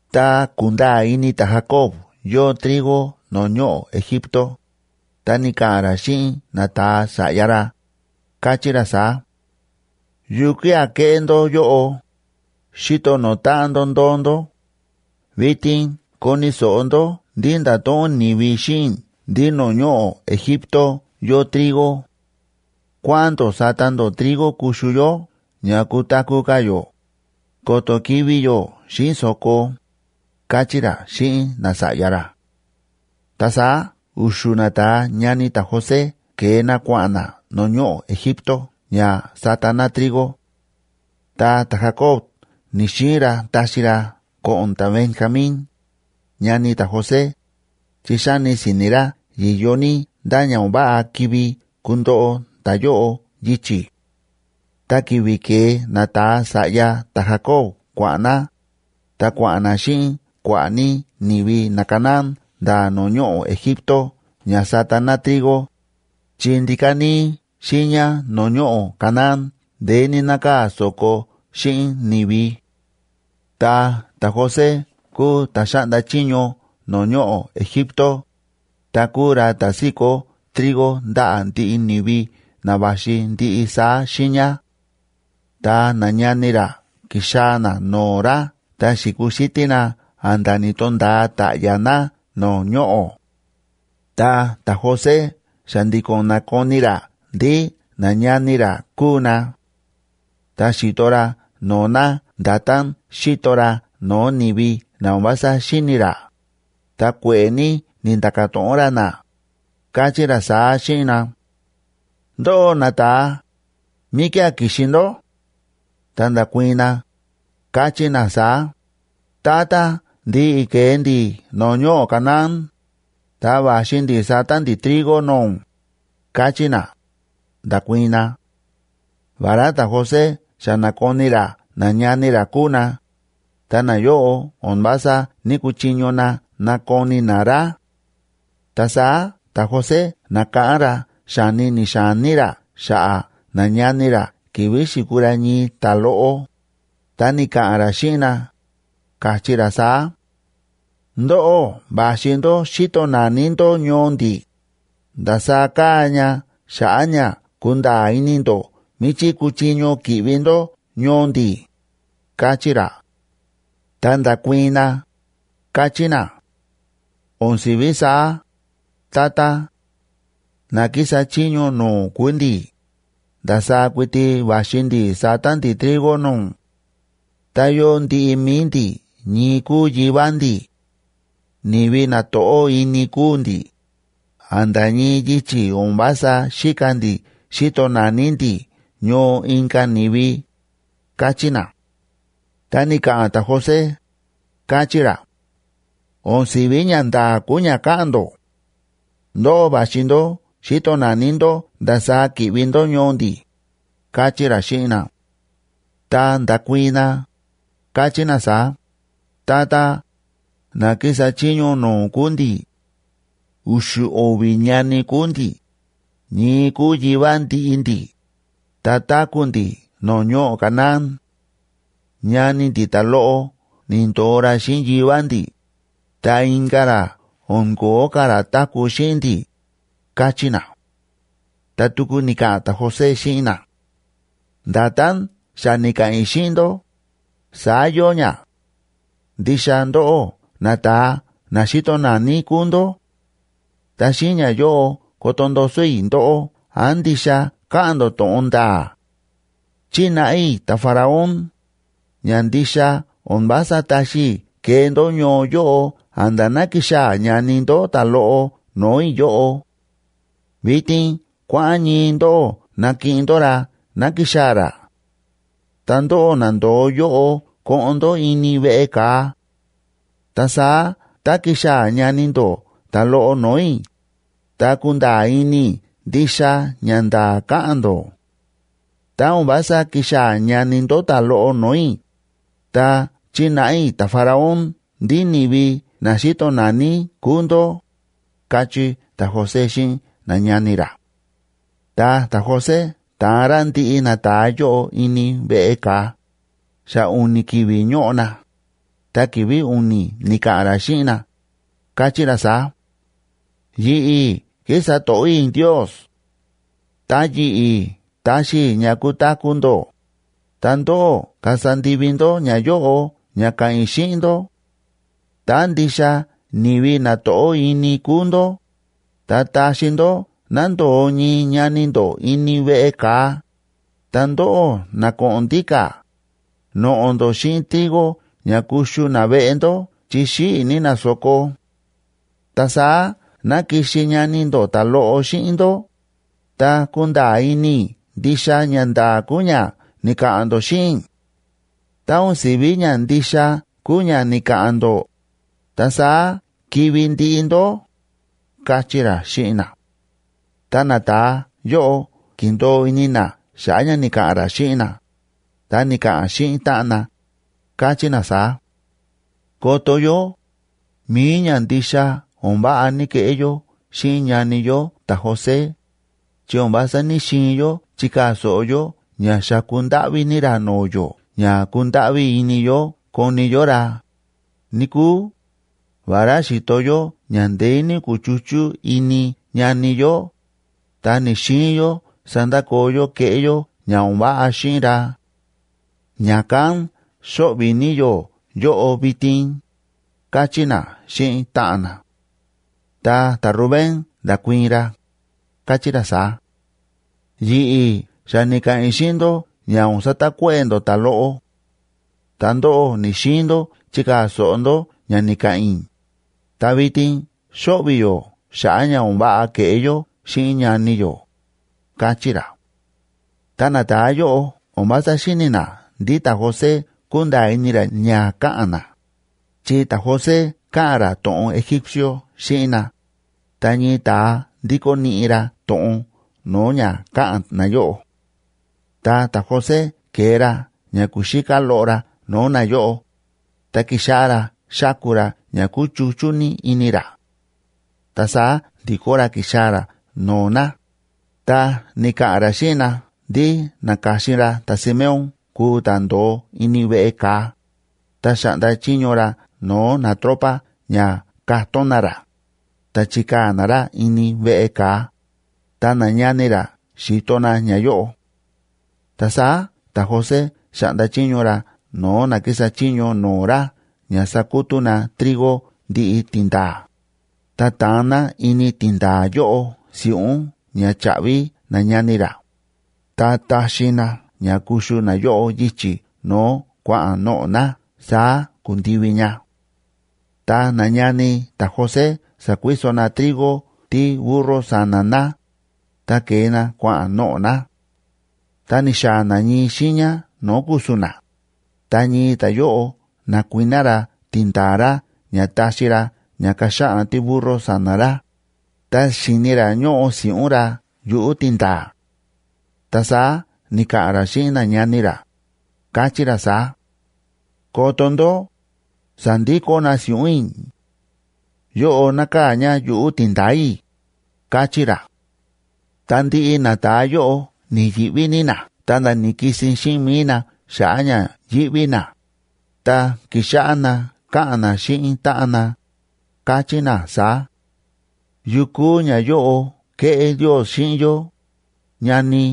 Tá ku̱nda̱a̱ ini ta̱Jacob yóo trigo no̱o̱ ñoꞌo̱ Egipto, ta ni̱ka̱ꞌa̱n ra xíꞌin nata̱a sa̱ꞌya ra, káchí ra saá: ―¿Yukía̱ kéꞌé ndó yóꞌo, xíto no̱o̱ táꞌan ndó ndóo ndó? Vitin koni̱ so̱ꞌo ndó ndí nda̱to̱ꞌon ni̱vi xíꞌin i̱ ndí no̱o̱ ñoꞌo̱ Egipto yóo trigo. Kuáꞌa̱n ndó sata ndó trigo kuxu yó ña kutaku̱ ka̱ yó, ko̱to̱ kivi̱ yó xíꞌin so̱ko ―káchí ra xíꞌin nasa̱ꞌya ra. Ta saá u̱xu̱ nata̱a ñani ta̱José ke̱e na kua̱ꞌa̱n na no̱o̱ ñoꞌo̱ Egipto ña sata na trigo; ta ta̱Jacob ni̱‑xiin ra taxi ra ko̱ꞌo̱n ta̱Benjamín, ñani ta̱José, chi xáni si̱ni̱ ra yi̱yo ní ndá ña o̱n váꞌa kivi kundoꞌo ta̱yóꞌo yichi̱. Ta ki̱vi̱ ke̱e nata̱a sa̱ꞌya ta̱Jacoba kua̱ꞌa̱n na, ta kua̱ꞌa̱n na xíꞌin kua̱ꞌa̱ ní ni̱vi naCanaán nda̱ no̱o̱ ñoꞌo̱ Egipto ña sata na trigo, chi ndíka̱ níí xiiña no̱o̱ ñoꞌo̱ Canaán ndeé ní nákaa̱ so̱ko xíꞌin ni̱vi. Ta ta̱José kúu ta̱ xáꞌnda chiño no̱o̱ ñoꞌo̱ Egipto, ta kúu ra ta̱ síkó trigo ndaꞌa̱ ndiꞌi ni̱vi na va̱xi ndiꞌi saá xiiña. Ta nañani ra ki̱xaa̱ na no̱o̱ ra ta xi̱kuxítí na a̱nda̱ ni̱to̱nda̱a ta̱ꞌya̱ na no̱o̱ ñoꞌo̱. Ta ta̱José xa̱ndi̱ko̱n na̱koni ra ndí nañani ra kúu na; ta xi̱to ra no̱o̱ na nda̱tán xíto ra no̱o̱ ni̱vi na o̱n vása xíni̱ ra, ta kue̱ꞌe̱ ní ni̱nda̱ka̱ to̱ꞌon ra na, káchí ra saá xíꞌin na: ―Ndóꞌó nata̱a, ¿míkía̱ ki̱xi ndó? Ta nda̱kuii̱n na, káchí na saá: ―Tata, ndi̱ꞌi̱ ke̱e ndi̱ no̱o̱ ñoꞌo̱ Canaán, ta va̱xi ndi̱ sata ndi̱ trigo no̱o̱ ún ―káchí na, nda̱kuii̱n na. Vará ta̱José xa na̱koni ra nañani ra kúu na, ta nayóꞌo o̱n vása ní‑kuchiño na nakoni na ra. Ta saá ta̱José na̱káꞌán ra xa̱ni ni̱xa̱ní ra xa̱ꞌa̱ nañani ra ki̱vi̱ xi̱kuu ra ñii ta̱loꞌo, ta ni̱ka̱ꞌa̱n ra xíꞌin na, káchí ra saá: ―Ndóꞌó va̱xi ndó xíto nani ndó ñoo ndi̱, ndasaá káa ña xa̱ꞌa̱ ña kunda̱a̱ ini ndó míchí kuchiño ki̱ꞌvi ndó ñoo ndi̱ ―káchí ra. Ta nda̱kuii̱n na, káchí na: ―¡O̱n si̱ví saá, tata! Na kísa chiño no̱o̱ ún kúu ndi̱, ndasaá kuiti va̱xi ndi̱ sata ndi̱ trigo no̱o̱ ún. Ta yóo ndiꞌi mi̱i ndi̱ ñii kúu yivá ndi̱. Ni̱vi na to̱ꞌó ini kúu ndi̱, a̱nda̱ ñii yichi̱ o̱n vása xíka ndi̱ xíto nani ndi̱ ñoo inka̱ ni̱vi ―káchí na. Ta ni̱ka̱ꞌa̱n ta̱José, káchí ra: ―O̱n si̱ví ñanda̱a̱ kúu ña káꞌa̱n ndó. Ndóꞌó va̱xi ndó xíto nani ndó ndasaá ki̱ꞌvi ndó ñoo ndi̱ ―káchí ra xíꞌin na. Ta nda̱kuii̱n na, káchí na saá: ―Tata, na kísa chiño no̱o̱ ún kúu ndi̱. U̱xu̱ o̱vi̱ ñani kúu ndi̱, ñii kúu yivá ndiꞌi ndi̱, ta táku̱ ndi̱ no̱o̱ ñoꞌo̱ Canaán. Ñani ndi̱ ta̱loꞌo ni̱ndo̱o ra xíꞌin yivá ndi̱, ta inka̱ ra o̱n ko̱ó ka̱ ra táku̱ xíꞌin ndi̱ ―káchí na. Ta tuku ni̱ka̱ꞌa̱n ta̱José xíꞌin na: ―Nda̱tán xa ni̱ka̱ꞌa̱n i̱ xíꞌin ndó, saá yóo ña; ndixa ndóꞌó nata̱a na xíto nani kúu ndó. Ta xíꞌin ñayóꞌo koto ndoso i̱ ndóꞌó án ndixa káꞌa̱n ndó to̱ꞌon nda̱a̱. Chínáꞌa i̱ ta̱Faraón, ña ndixa o̱n vása taxi i̱ kee ndó ñoo yóꞌo a̱nda̱ ná kixaa̱ ñani ndó ta̱loꞌo no̱o̱ i̱ yóꞌo. Vitin kuáꞌa̱n ñii ndóꞌó nakiꞌin ndó ra ná kixaa̱ ra. Ta ndóꞌó na ndo̱o yóꞌo koꞌon ndó ini veꞌe ka̱a. Ta saá tá kixaa̱ ñani ndó ta̱loꞌo no̱o̱ i̱, ta kunda̱a̱ ini i̱ ndixa ñanda̱a̱ káꞌa̱n ndó; tá o̱n vása kixaa̱ ñani ndó ta̱loꞌo no̱o̱ i̱, ta chínáꞌa i̱ ta̱Faraón ndí ni̱vi na xíto nani kúu ndó ―káchí ta̱José xíꞌin nañani ra. Ta ta̱José ta̱an ra ndiꞌi nata̱a yóꞌo ini veꞌe ka̱a, xa u̱ni̱ ki̱vi̱ ñóꞌo na, ta ki̱vi̱ u̱ni̱ ni̱ka̱ꞌa̱n ra xíꞌin na, káchí ra saá: ―Yi̱ꞌi̱ kísa to̱ꞌó i̱ Ndios. Ta yi̱ꞌi̱ taxi i̱ ña kutaku̱ ndó, tá ndóꞌó kasa ndivi ndó ñayóꞌo ña ka̱ꞌa̱n i̱ xíꞌin ndó: tá ndixa ni̱vi na to̱ꞌó ini kúu ndó, ta taxi ndó ná ndo̱o ñii ñani ndó ini veꞌe ka̱a, ta ndóꞌó na ko̱ꞌo̱n ndíka̱, noꞌo̱ ndó xíꞌin trigo ña kuxu naveꞌe ndó chi xíꞌi̱ ní na so̱ko. Ta saá ná kixi ñani ndó ta̱loꞌo xíꞌin ndó, ta kunda̱a̱ ini i̱ ndixa ñanda̱a̱ kúu ña ni̱ka̱ꞌa̱n ndó xíꞌin i̱. Tá o̱n si̱ví ñandixa kúu ña ni̱ka̱ꞌa̱n ndó, ta saá kivi̱ ndiꞌi ndó ―káchí ra xíꞌin na. Ta nata̱a yóꞌo ki̱ndo̱o ini na xa̱ꞌa̱ ña ni̱ka̱ꞌa̱n ra xíꞌin na, ta ni̱ka̱ꞌa̱n xíꞌin táꞌan na, káchí na saá: ―Koto yó, mi̱i ñandixa o̱n váꞌa ni̱keꞌé yó xíꞌin ñani yó ta̱José, chi o̱n vása ní‑xiin yó chikaa̱ so̱ꞌo yó ña xa̱ku ndáꞌví ní ra no̱o̱ yó ña kundáꞌví ini yó koni yó ra, níkúu. Vará xi̱to yó ña ndeé ní ku̱chuchú ini ñani yó, ta ni̱‑xiin yó sandakoo yó kéꞌé yó ña o̱n váꞌa xíꞌin ra. Ña̱kán xóꞌvi̱ ní yó yóꞌo vitin ―káchí na xíꞌin táꞌan na. Ta ta̱Rubén nda̱kuii̱n ra, káchí ra saá: ―Yi̱ꞌi̱ xa ni̱ka̱ꞌa̱n i̱ xíꞌin ndó ña o̱n satakuéꞌe̱ ndó ta̱loꞌo; ta ndóꞌó ni̱‑xiin ndó chikaa̱ so̱ꞌo ndó ña ni̱ka̱ꞌa̱n i̱, ta vitin xóꞌvi̱ yó xa̱ꞌa̱ ña o̱n váꞌa ke̱ꞌé yó xíꞌin ñani yó ―káchí ra. Ta nata̱a yóꞌo o̱n vása xíni̱ na ndí ta̱José kúnda̱a̱ ini ra ña káꞌa̱n na, chi ta̱José káꞌa̱n ra to̱ꞌon egípcio xíꞌin na, ta ñii ta̱a ndíkó niꞌi ra to̱ꞌon no̱o̱ ña káꞌa̱n nayóꞌo. Ta ta̱José ke̱e ra ña kuxíká loꞌo ra no̱o̱ nayóꞌo, ta ki̱xáꞌá ra xáku ra ña kúchuchú ní ini ra. Ta saá ndi̱kó ra ki̱xaa̱ ra no̱o̱ na, ta ni̱ka̱ꞌa̱n ra xíꞌin na ndí na̱ka̱xin ra ta̱Simeón kuu ta̱ ndo̱o ini veꞌe ka̱a, ta xa̱ꞌnda chiño ra no̱o̱ natropa ña katón na ra, ta chi̱kaa̱ na ra ini veꞌe ka̱a, ta nañani ra xi̱to na ñayóꞌo. Ta saá ta̱José xa̱ꞌnda chiño ra no̱o̱ na kísa chiño no̱o̱ ra ña sakutú na trigo ndiꞌi tindaa̱, ta taan na ini tindaa̱ yóꞌo si̱ꞌún ña cha̱ꞌvi nañani ra, ta taxi na ña kuxu nayóꞌo yichi̱ no̱o̱ kua̱ꞌa̱n noꞌo̱ na. Saá ku̱ndivi ña. Ta nañani ta̱José sa̱kuiso na trigo tíburro sa̱na̱ na, ta ke̱e na kua̱ꞌa̱n noꞌo̱ na. Tá ni̱xaa̱ na ñii xiiña no̱o̱ ku̱su̱n na, ta ñii ta̱yóꞌo na̱kuiná ra tindaa̱ ra ña taxi ra ña kaxaꞌan tíburro sa̱na̱ ra, ta xi̱ni ra ñóꞌo si̱ꞌún ra yuꞌu̱ tindaa̱. Ta saá ni̱ka̱ꞌa̱n ra xíꞌin nañani ra, káchí ra saá: ―Koto ndó, sa̱ndikó na si̱ꞌún i̱. Yóꞌo nákaa̱ ña yuꞌu̱ tindaa̱ i̱ ―káchí ra. Ta ndiꞌi nata̱a yóꞌo ni̱yi̱ꞌví ní na, ta nda̱ ni̱kisin xíꞌin mi̱i na xa̱ꞌa̱ ña yíꞌví na, ta ki̱xáꞌá na káꞌa̱n na xíꞌin táꞌan na, káchí na saá: ―¿Yukú ñayóꞌo kéꞌé Ndios xíꞌin yó?, ñani.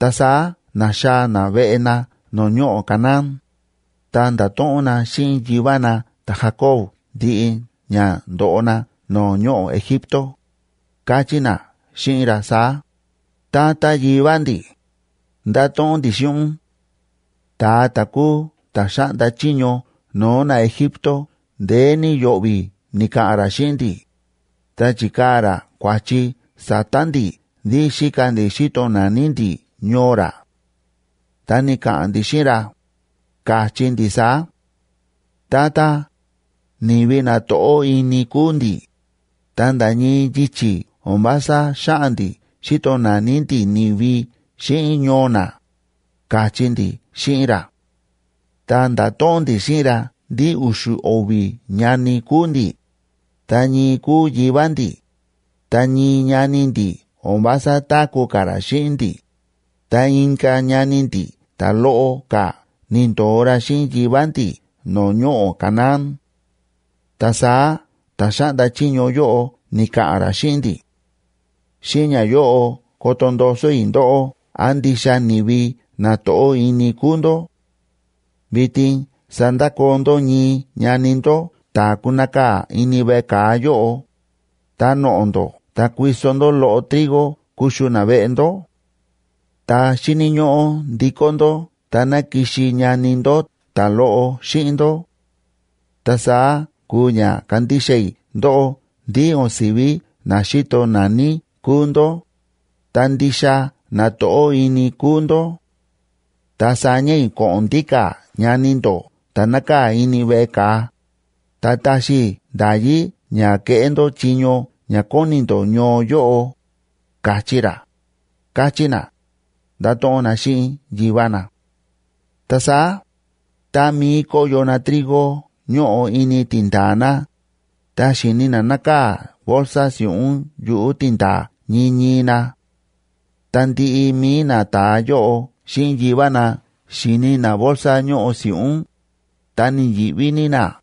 Ta saá na̱xaa̱ na veꞌe na no̱o̱ ñoꞌo̱ Canaán, ta nda̱to̱ꞌon na xíꞌin yivá na ta̱Jacob ndiꞌi ña ndo̱ꞌo na no̱o̱ ñoꞌo̱ Egipto, káchí na xíꞌin ra saá: ―Tata yivá ndi̱, ndáto̱ꞌon ndi̱ xíꞌin ún, ta̱a ta̱ kúu ta̱ xáꞌnda chiño no̱o̱ naEgipto ndeé ní yo̱ꞌvi̱ ni̱ka̱ꞌa̱n ra xíꞌin ndi̱, ta chi̱kaa̱ ra kua̱chi sa̱ta̱ ndi̱ ndí xíka ndi̱ xíto nani ndi̱ ñoo ra. Ta ni̱ka̱ꞌa̱n ndi̱ xíꞌin ra, ka̱chí ndi̱ saá: “Tata, ni̱vi na to̱ꞌó ini kúu ndi̱, ta nda̱ ñii yichi̱ o̱n vása xáꞌa̱n ndi̱ xíto nani ndi̱ ni̱vi xíꞌin ñoo na”, ka̱chí ndi̱ xíꞌin ra. Ta nda̱to̱ꞌon ndi̱ xíꞌin ra ndí u̱xu̱ o̱vi̱ ñani kúu ndi̱, ta ñii kúu yivá ndi̱, ta ñii ñani ndi̱ o̱n vása táku̱ ka̱ ra xíꞌin ndi̱, ta inka̱ ñani ndi̱ ta̱loꞌo ka̱ ni̱ndo̱o ra xíꞌin yivá ndi̱ no̱o̱ ñoꞌo̱ Canaán. Ta saá ta̱ xáꞌnda chiño yóꞌo ni̱ka̱ꞌa̱n ra xíꞌin ndi̱: “Xíꞌin ñayóꞌo koto ndoso i̱ ndóꞌó án ndixa ni̱vi na to̱ꞌó ini kúu ndó. Vitin sandakoo ndó ñii ñani ndó ta̱ kunakaa̱ ini veꞌe ka̱a yóꞌo, ta noꞌo̱ ndó ta kuiso ndó loꞌo trigo kuxu naveꞌe ndó. Ta xíni̱ ñóꞌó ndikó ndó ta ná kixi ñani ndó ta̱loꞌo xíꞌin ndó. Ta saá kuu ña kandixa i̱ ndóꞌó ndí o̱n si̱ví na xíto nani kúu ndó, ta ndixa na to̱ꞌó ini kúu ndó; ta saña i̱ ko̱ꞌo̱n ndíka̱ ñani ndó ta̱ nákaa̱ ini veꞌe ka̱a, ta taxi i̱ nda̱yí ña keꞌé ndó chiño ña kóni ndó ñoo yóꞌo”, ka̱chí ra ―káchí na, ndáto̱ꞌon na xíꞌin yivá na. Ta saá, tá mií kóyo na trigo ñóꞌo ini tindaa̱ na, ta xi̱ni na nákaa̱ bolsa si̱ꞌún yuꞌu̱ tindaa̱ ñii ñii na. Tá ndiꞌi mi̱i nata̱a yóꞌo xíꞌin yivá na xi̱ni na bolsa ñóꞌo si̱ꞌún, ta ni̱yi̱ꞌví ní na.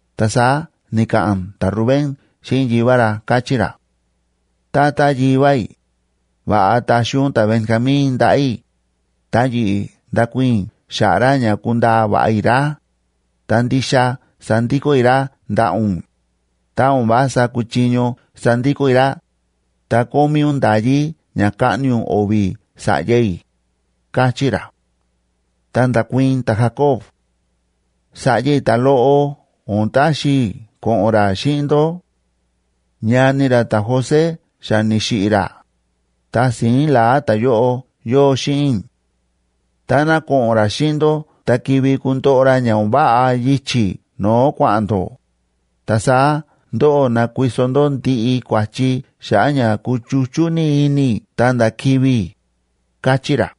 Ta saá ni̱ka̱ꞌa̱n ta̱Rubén xíꞌin yivá ra, káchí ra: ―Tata yivá i̱, va̱ꞌa taxi ún ta̱Benjamín ndaꞌa̱ i̱, ta yi̱ꞌi̱ ndakuii̱n i̱ xa̱ꞌa̱ ra ña kundaa va̱ꞌa i̱ ra, ta ndixa sandikó i̱ ra ndaꞌa̱ ún. Tá o̱n vása kuchiño sandikó i̱ ra, ta kómí ún nda̱yí ña kaꞌni ún o̱vi̱ sa̱ꞌya i̱ ―káchí ra. Ta nda̱kuii̱n ta̱Jacob: ―Sa̱ꞌya i̱ ta̱loꞌo o̱n taxi i̱ ko̱ꞌo̱n ra xíꞌin ndó. Ñani ra ta̱José xa ni̱xiꞌi̱ ra, ta si̱ín la̱á ta̱yóꞌo yóo xíꞌin i̱. Táná ko̱ꞌo̱n ra xíꞌin ndó ta kivi kundoꞌo ra ña o̱n váꞌa yichi̱ no̱o̱ kua̱ꞌa̱n ndó, ta saá ndóꞌó nakuiso ndó ndiꞌi kua̱chi xa̱ꞌa̱ ña kuchuchú ní ini i̱ ta nda̱ kivi̱ i̱ ―káchí ra.